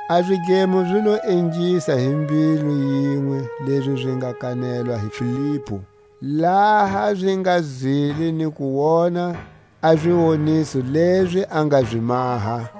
A zidlemo zi lo ingisa hi mbilu yinwe lezi zi nga kanelwa hi Filipu, laha zi nga zwile ni ku wona a ziwoniso lezi a nga zi maha.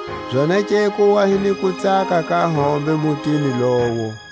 Zonake ku wa hi ni kutsaka ka hombe mutini lowo.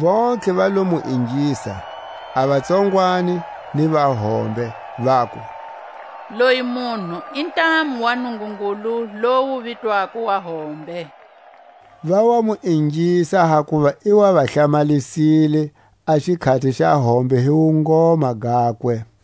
Vontlhe va lo mu ingisa, a vatsongwani ni vahombe, vaku: Loyi munhu i ntamu wa Nungungulu lowu wu vitwako Wa hombe. Va wa mu ingisa hakuva i wa va hlamalisile a xikhati xa hombe hi wungoma gakwe.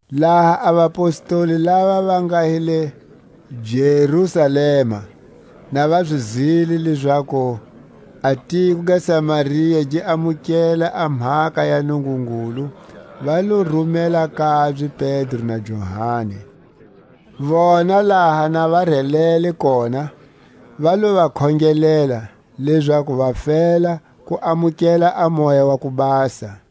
Laha a vapostoli lava va nga hi le Jerusalema na va zwile lezaku a tiko ga Samaria gi amukele a mhaka ya Nungungulu, va lo rumela kabye Pedro na Johani. Vona laha na va relele kona, va lo va khongelela, lezaku va fela ku amukela a Moya wa ku Basa;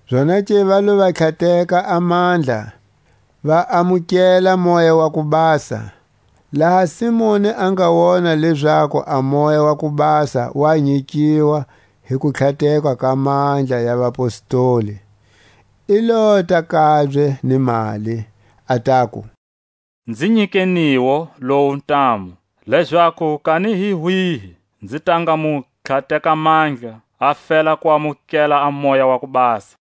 Zonake va lo va tlhateka a mandla, va amukela Moya wa ku Basa. Laha Simoni a nga wona lezaku a Moya wa ku Basa wa nyikiwa hi kutlhatekwa ka mandla ya vapostoli, i lota kabye ni mali, a taku: Nzi nyikeniwo lowu ntamu, lezaku kani hi wihi nzi ta nga mu tlhateka mandla, a fela ku amukela a Moya wa ku Basa.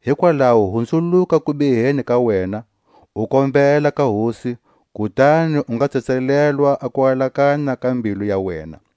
Hikwalaho hunzuluka kubiheni ka wena, u kombela ka Hosi, kutani u nga tsetselelwa a kualakanya ka mbilu ya wena.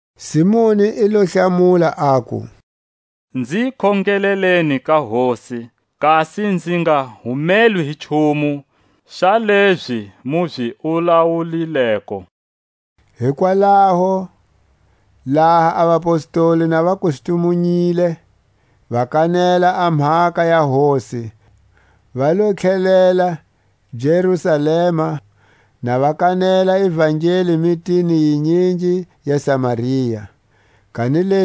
Simoni i lo hlamula, aku: Nzi khongeleleni ka Hosi, kasi nzi nga humelwi hi nchumu xa lezi mu zi wulawulileko. Hikwalaho laha a vapostoli na va kustumunyile, va kanela a mhaka ya Hosi, va lo tlhelela Jerusalema na va kanela ivangeli mitini yinyingi ya vaSamaria. Filipu ni muEtiopia.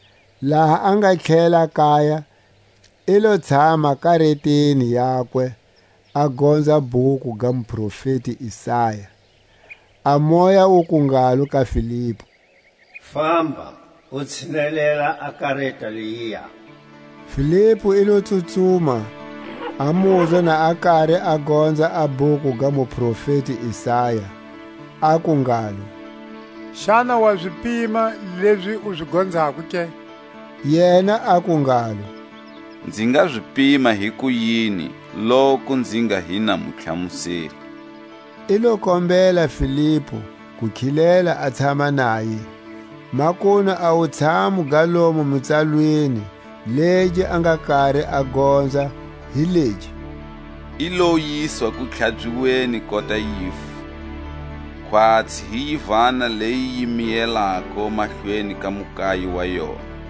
laha a nga tlhelela kaya, i lo tshama kareteni yakwe, a gonza bhuku ga muprofeti Isaya. A Moya wuku ngalo ka Filipu: Famba, u tshinelela a kareta leyiya. Filipu i lo tsutsuma, a muzwa na a kari a gonza a bhuku ga muprofeti Isaya, aku ngalo: Xana wa zi pima lezi u zi gonzako ke? Yena aku ngalo: Nzi nga zi pima hikuyini loku nzi nga hi na mutlhamuseli? I lo kombela Filipu ku khilela a tshama naye. Makunu a wutshamu ga lomo mitsalweni legi a nga kari a gonza hi legi: I lo yiswa kutlhabyiweni kota yivu, Khwatsi hi yivana leyi yi miyelako mahlweni ka mukayi wa yona,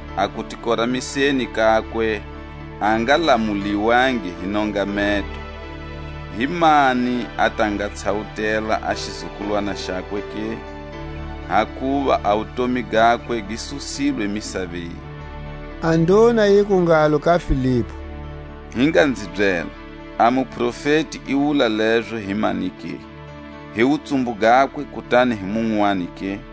A kutikoramiseni kakwe a nga lamuliwangi hi nongameto; Himani a ta nga tshawutela a xizukulwana xakwe ke? Hakuva a wutomi gakwe gi susilwe misaveni. A nduna yiku ngalo ka Filipu: Hi nga nzi byela, a muprofeti i wula lezo hi mani ke? Hi wutsumbu gakwe, kutani hi munwani ke?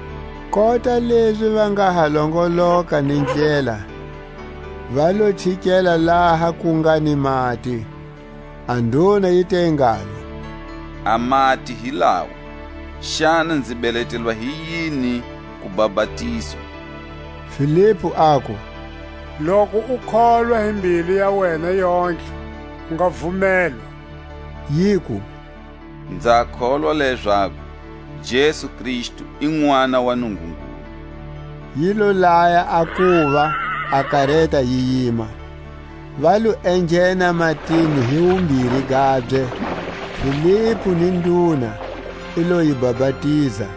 Kota lezi va nga ha longoloka ni ndlela, va lo chikela laha ku nga ni mati. A nduna yi te ngalo; A mati hi lawa; xana nzi beletelwa hi yini ku bapatizwa? Filipu aku: Loku u kholwa hi mbilu ya wena yontlhe u nga vumelwa. Yiku: Nza kholwa lezaku Jesu Kristu i Nʼwana wa Nungungulu. Yi lo laya a kuva a kareta yi yima; va lo enghena matini hi wumbiri gabye, Filipu ni nduna; i lo yi bapatiza.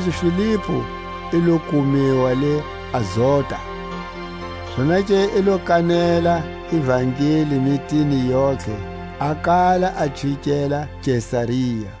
Kanilezi Filipu i lo kumiwa le Azota; zonake i lo kanela ivangeli mitini yontlhe a kala a chikela Kesaria.